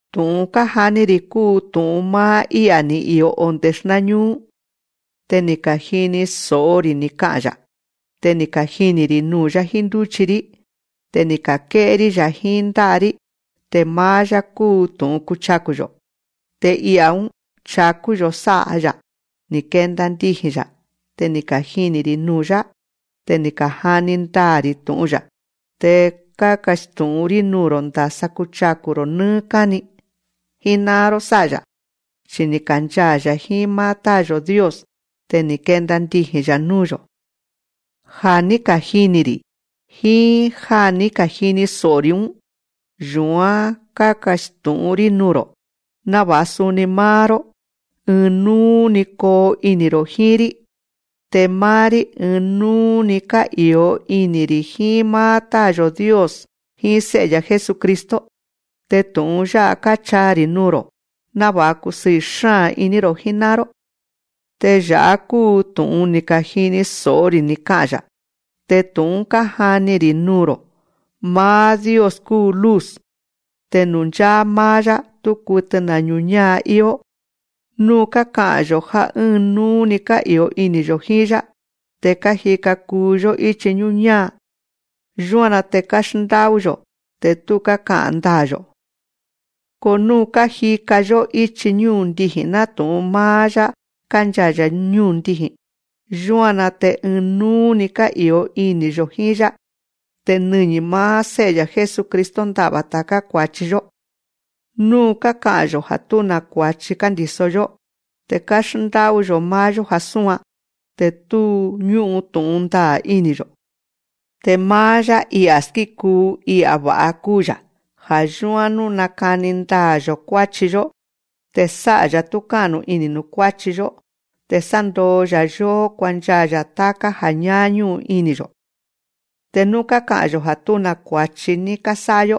Tu̱'un kájani‑ri̱ kúu tu̱'un máá I'a̱ ni̱ i̱o onde̱ xnáñúú. Te ni̱ ka̱jini so̱'o‑ri̱ ni̱ ka'a̱n‑ya̱. Te ni̱ kajini̱‑ri̱ nuu̱‑yá jíín ndúchi‑rí. Te ni̱ ka̱ké'é‑rí‑ya̱ jíín ndá'a‑rí. Te máá‑yá kúu tu̱'un kuchaku̱‑yo̱. Te I'a̱‑ún chakú‑yo̱ sá'a‑ya̱, ni̱ kenda ndiji̱n‑ya̱. Te ni̱ kajini̱‑ri̱ nuu̱‑yá. Te kájani ndaa̱‑ri̱ tu̱'un‑ya̱. Te kákastu̱'ún‑rí nuu̱‑ro̱ ndasa kuchaku̱‑ro̱ nɨ́ɨ́ káni jíná'an‑ró sá'a‑ya̱. Chi ni̱ kanchaa̱‑ya̱ jíín máá Táa̱‑yo̱ Dios. Te ni̱ kenda ndiji̱n‑ya̱ núu̱‑yo̱. Ja̱ ní kajini̱‑ri̱ jíín já ní kajini so̱'o‑ri̱‑ún, yu̱án kákastu̱'ún‑rí nuu̱‑ro̱, náva̱'a suni máá‑ró, ɨɨn núú‑ni koo ini̱‑ro̱ jíín‑rí. Te máá‑rí, ɨɨn núú‑ni ká'i̱o ini̱‑ri̱ jíín máá Táa̱‑yo̱ Dios jíín Sé'e‑ya̱ Jesucristo. Te tu̱'un yá'a káchaa‑ri̱ nuu̱‑ro̱ náva̱'a kusɨɨ̱ xáa̱n iní‑ro̱ jíná'an‑ró. Te ya̱'á kúu tu̱'un ni̱ ka̱jini so̱'o‑ri̱ ni̱ ka'a̱n‑ya̱. Te tu̱'un‑ún kájani‑ri̱ nuu̱‑ro̱: Máá Dios kúu luz. Te nuu̱ ncháá máá‑yá, tú kutɨ na̱ ñu̱ñáa íó. Nú káka'a̱n‑yo̱ já ɨ́ɨn núú‑ni ká'i̱o ini̱‑yo̱ jíín‑yá, te kájika kuu‑yó íchi ñúñáa. Yúan‑na te káxndá'ú‑yo̱, te tú káka'a̱n ndaa̱‑yo̱. Ko nú kájika‑yó íchi ñúndiji̱n nátu̱'un máá‑yá kánchaa̱‑ya̱ ñúndiji̱n, yúan‑na te ɨɨn núú‑ni ká'i̱o ini̱‑yo̱ jíín‑yá. Te nɨñi̱ máá Sé'e‑ya̱ Jesucristo nda'va̱ ta̱ká kua̱chi‑yó. Nú káka'a̱n‑yo̱ já tú na̱ kua̱chi kándi̱so‑yó, te káxndá'ú‑yo̱ máá‑yó já súan, te tú ñú'un tu̱'un ndaa̱ ini̱‑yo̱. Te máá‑yá, I'a̱ skíkuu, I'a̱ va̱'a kúu‑ya̱. Ja̱ yúán nú nakani ndaa̱‑yo̱ kuáchi‑yó, te sá'a‑ya̱ túká'nu ini̱ nuu̱ kuáchi‑yó, te sándoo‑ya̱ yóó kuanchaa̱‑ya̱ táká ja̱ ñáá ñú'un ini̱‑yo̱. Te nú ka'a̱n‑yo̱ já tú na̱ kua̱chi ní kásá'a‑yó,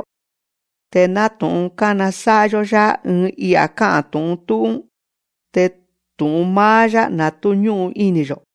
te nátu̱'un kánasá'a‑yó‑yá ɨɨn I'a̱ ká'a̱n tu̱'un tú'ún, te tu̱'un máá‑yá na̱ tú ñú'un ini̱‑yo̱.